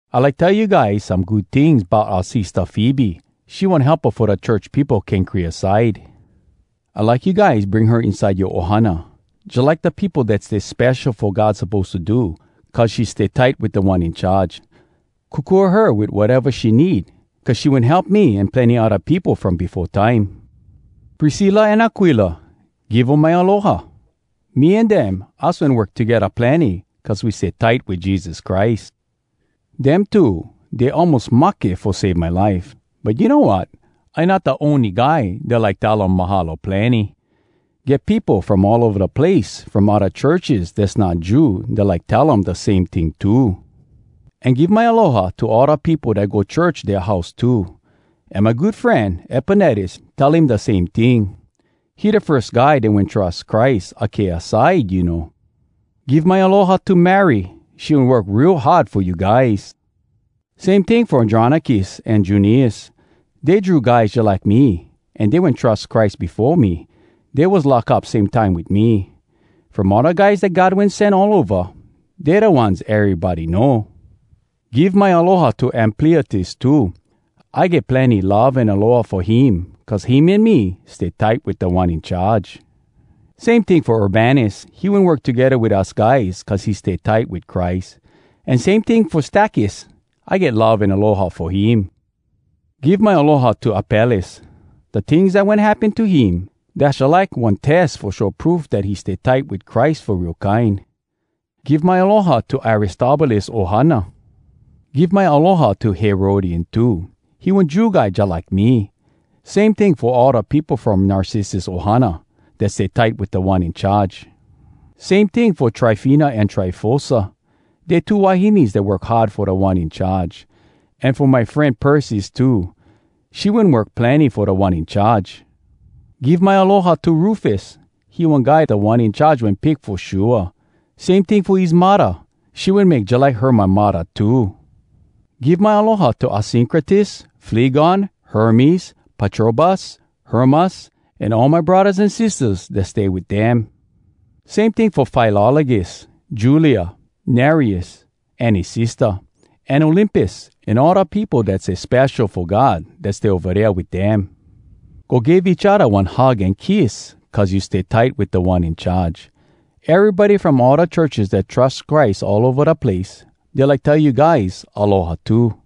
I like tell you guys some good tings bout oua sistah Febe. She one helpa fo da church peopo Kenkrea side. I like you guys bring her inside yoa ohana, jalike da peopo dat stay spesho fo God suppose to do cuz she stay tight wit Da One In Charge. Kokua her wit wateva she need cuz she wen help me an plenny odda peopo from befo time. Priscilla an Aquila, give um my aloha. Me an dem, us wen work togedda plenny cuz we stay tight wit Jesus Christ. Dem two, dey almos mahke fo save my life. But you know wat? I not da ony guy dat like tell um “Mahalo plenny!” Get peopo from all ova da place from odda churches dass not Jew dat like tell um da same ting too. An give my aloha to all da peopo dat go church dea house too. An my good fren, Epenetus, tell him da same ting. He da firs guy dat wen trus Christ Akaia side, you know. Give my aloha to Mary. She wen work real hard fo you guys. Same ting fo Andronicus an Junias. Dey Jew guys jalike me an dey wen trus Christ befo me. Dey was lock up same time wit me. From all da guys dat God wen sen all ova, dey da ones erybody know. Give my aloha to Ampliatus too. I get plenny love an aloha fo him cuz him an me stay tight wit Da One In Charge. Same ting fo Urbanus, he wen work togedda wit us guys cuz he stay tight wit Christ. An same ting fo Stakys. I get love an aloha fo him. Give my aloha to Apelles. Da tings dat wen happen to him, dass jalike one tes fo show proof dat he stay tight wit Christ fo real kine. Give my aloha to Aristobulus ohana. Give my aloha to Herodion too. He one Jew guy jalike me. Same ting fo all da peopo from Narcissus ohana dat stay tight wit Da One In Charge. Same ting fo Tryfena an Tryfosa. Dey two wahines dat work hard fo Da One In Charge. An fo my fren Persis too. She wen work plenny fo Da One In Charge. Give my aloha to Rufus. He one guy Da One In Charge wen pick fo shua. Same ting fo his muddah. She wen make jalike her my muddah too. Give my aloha to Asyncritus, Flegon, Hermes, Patrobas, Hermas, an all my braddahs an sistahs dat stay wit dem. Same ting fo Filologus, Julia, Nereus, an his sistah, an Olympas, an all da peopo dat stay spesho fo God dat stay ova dea wit dem. Go give each odda one hug an kiss cuz you stay tight wit Da One In Charge. Erybody from all da churches dat trus Christ all ova da place, dey like tell you guys “Aloha” too.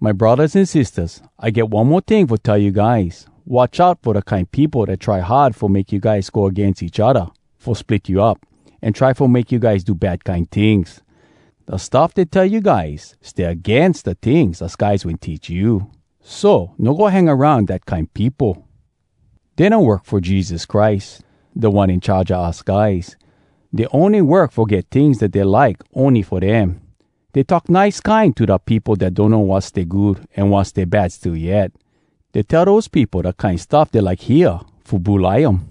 My braddahs an sistahs, I get one mo ting fo tell you guys: Watch out fo da kine peopo dat try hard fo make you guys go agains each odda fo split you up, an try fo make you guys do bad kine tings! Da stuff dey tell you guys stay agains da tings us guys wen teach you. So, no go hang aroun dat kine peopo! Dey no work fo Jesus Christ, Da One In Charge a us guys. Dey ony work fo get tings dat dey like ony fo dem. Dey talk nice kine to da peopo dat donno wat stay good an wat stay bad still yet. Dey tell dose peopo da kine stuff dey like hear fo bulai um.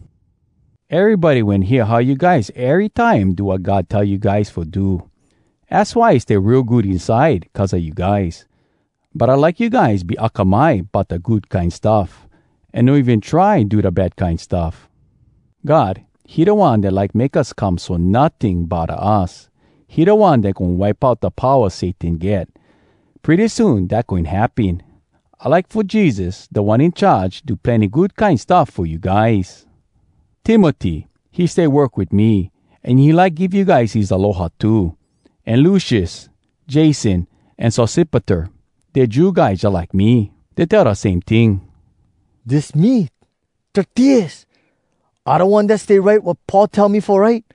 Erybody wen hear how you guys erytime do wat God tell you guys fo do. Az why I stay real good inside cuz a you guys. But I like you guys be akamai bout da good kine stuff an no even try do da bad kine stuff. God, he da One dat like make us come so notting bodda us. He da One dat goin wipe out da powa Satan get. Pretty soon dat goin happen. I like fo Jesus, Da One In Charge, do plenny good kine stuff fo you guys. Timoty, he stay work wit me, an he like give you guys his aloha too. An Lucius, Jason, an Sosipater, dey Jew guys jalike me. Dey tell da same ting. (Dis me, Tertius. I da one dat stay write wat Paul tell me fo write.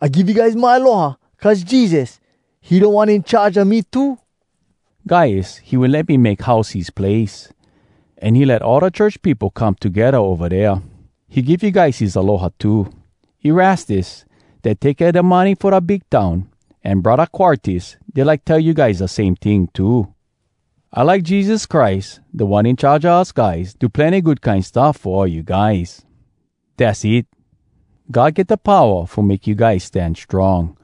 I give you guys my aloha, cuz Jesus, he Da One In Charge a me too.) Gaius, he wen let me make house his place. An he let all da church peopo come togedda ova dea. He give you guys his aloha too. Erastus, dat take kea da money fo da big town, an Braddah Quartus, dey like tell you guys da same ting too. [I like Jesus Christ, Da One In Charge a us guys, do plenny good kine stuff fo all you guys. Dass it!] God get da powa fo make you guys stan strong.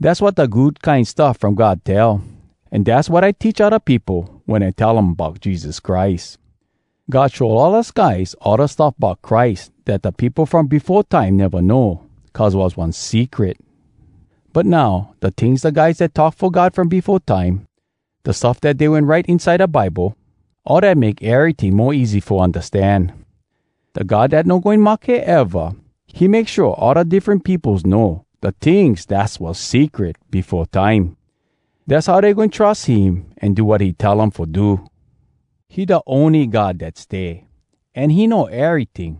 Dass wat da Good Kine Stuff From God tell, an dass wat I teach odda peopo, wen I tell um bout Jesus Christ. God show all us guys all da stuff bout Christ dat da peopo from befo time neva know cuz was one secret. But now, da tings da guys dat talk fo God from befo time, da stuff dat dey wen write inside da Bible, all dat make eryting mo easy fo undastan. Da God dat no goin mahke eva, he make shua all da diffren peopos know da tings dass was secret befo time. Dass how dey goin trus him an do wat he tell um fo do. He da ony God dat stay, an he know eryting.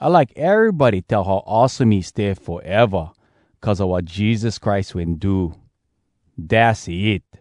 I like erybody tell how awesome he stay foeva cuz a wat Jesus Christ wen do! Dass it!